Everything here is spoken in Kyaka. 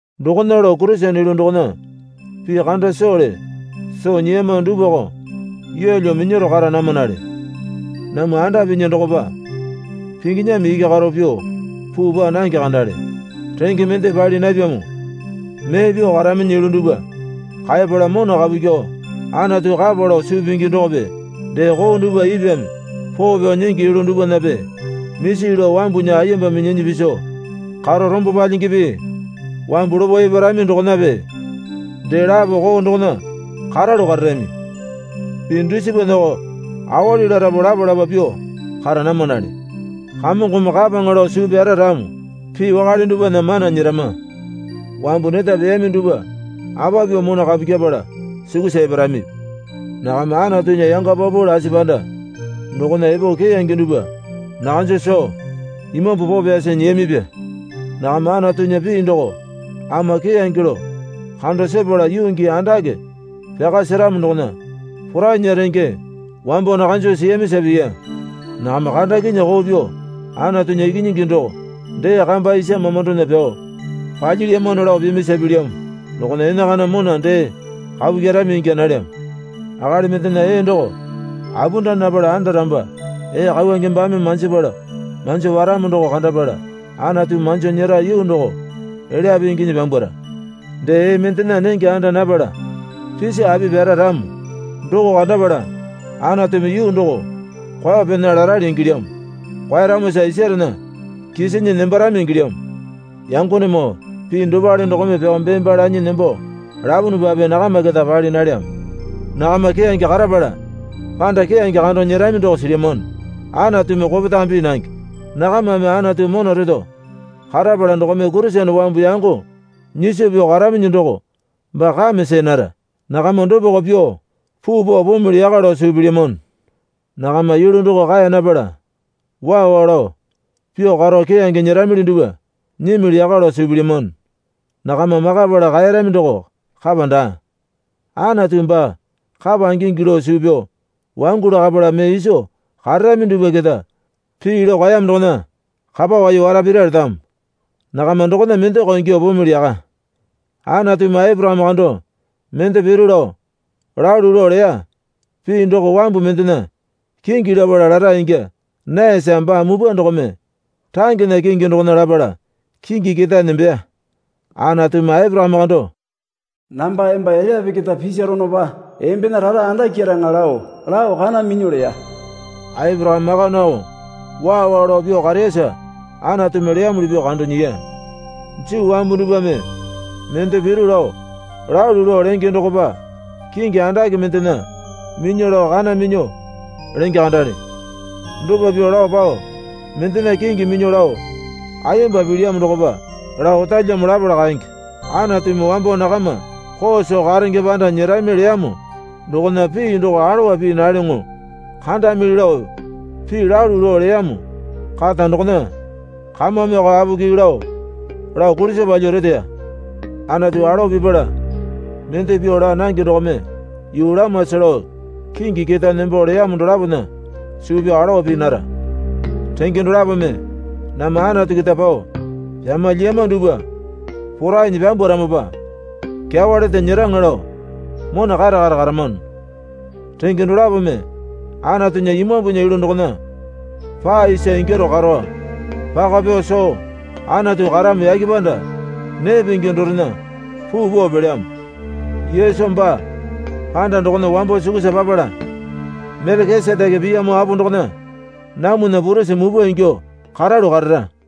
Dokona lao Kurisene yulu dokona pii kanda sowale soo nyiyama dupwako yeelyo minyaro kara namanale. Namwa anda pinya dokopa pinginyame iki karo pyuo puu paa nange kandale. Renge mende pali napyamo mee pyuo karaminyi yulu dupwa kaeyapala mona kapu kyuo Anatu kapa lao suu pingi dokope dee koo dupwa ipwame poo pyao nyingi yulu dupwanape misi lao wambunya ayemba minyinyi piso karo rombo palyingipi wambu lopo eparami dokonape dee lapo koo dokona karalu kararami. Pii dusipanako awali larapu lapa lapa pyuo kara namanale. Kamongome kapaŋa lao suu pyara ramo pii wakale dupwana mana nyerama. Wambu neta peyami dupwa apa pyuo mona kapu kyepala sukusa eparami? Nakama Anatunya yanga paupau lasi panda dokona epo keyange dupwa nakanjo soo Imambu Poo Pyasi nyiyamipya. Nakama Anatunya pii doko ama keyange lao kando sepala yuu gii andake pyaka seramo dokona porainya renge wambo nakanjo siyamisa piya. Nakama kandakinyuo koo pyuo Anatunya Ikinyingi doko dee kamba isa mamandona pyao palyilyamano lao pimisa pilyamo dokona enakana mona dee kapu kyerami ingya nalyamo. Akali mendena ee doko apunda napala andaramopa ee kauwange baame manjipala manjo paramo doko kandapala Anatumi manjo nyera yuu doko elyape inginyi pyambwara. Dee ee mendena nenge anda napala pisi api pyara ramo doko kandapala Anatumi yuu doko kwao pena larali ingilyamo. Kwaeyaramosa isarena kisinyi nembarami ingilyamo. Yangonemoo pii dopale dokome pyao bee baa lanyi nembo lapunupape nakama keta pali nalyamo. Nakama keyange karapala panda keyange kando nyerami doko silyamano. Anatumi kopetame pii nange. Nakamame Anatu mona reto karapala dokome Kurisene wambu yango nyiso pyuo karaminyi doko baa kame see nara. Nakama dopako pyuo puu pao pumili yaka lao suu pilyamano. Nakama yulu doko kaeya napala waa waa lao pyuo karo keyange nyeramili dupwa nyimili yaka lao suu pilyamano. Nakama makapala kaeyarami doko kapa daa. Anatu baa kapa ingingi lao suu pyao wangu lakapala mee iso kararami dupwa keta pii lao kaeyamo dokona kapa wai wara pira letamo. Nakama dokona mendako ingyuo pumili yaka. Anatumi Aporakame kando mende piru lao lalu lao leya. Pii doko wambu mendena kingi lapala lara ingya nayasa baa mupwa dokome rangena kingi dokona lapala kingi ketae nembeya. Anatumi Aporakame kando, Namba emba elyape keta pisaronopa embena rara andakyaraŋa lao lao kana minyuo leya. Aporakame maka nao waa waa lao pyuo kareyasa Anatumi leyamuli pyuo kando nyiya. Juu wambu dupwame mende piru lao lalu lao lenge dokopa kingi andake mendena minyuo lao kana minyuo lenge kandale. Dopa pyuo lao pao mendena kingi minyuo lao ayemba pilyamo dokopa lao otalyamo lapala kaenge. Anatumi wambo nakama koo soo karenge panda nyerami leyamo dokona pii doko alowa pii nalyoŋo kandamili lao pii lalu lao leyamo kata dokona kamameko apoki lao lao kulisa palyuo reteya. Anatu alowa pipala mende pyuo laa nange dokome yuu lamasa lao kingi ketae nembo leyamo dolapona suu pyao alowa pii nara. Renge dolapome namwa Anatu keta pao pyama lyiyama dupwa porainyi pyambwaramopa kyawa lete nyeraŋa lao mona kare kare karamano. Renge dolapome Anatunya Imambunya yulu dokona paa isa ingyaro karo paka pyao soo Anatu karamo yake panda nee pingi dorena puu pao pelyamo. Yesu baa panda dokona wambo sukusa papala Melekiseteke piyamo apo dokona namwana purisi mupwa ingyuo karalu karara.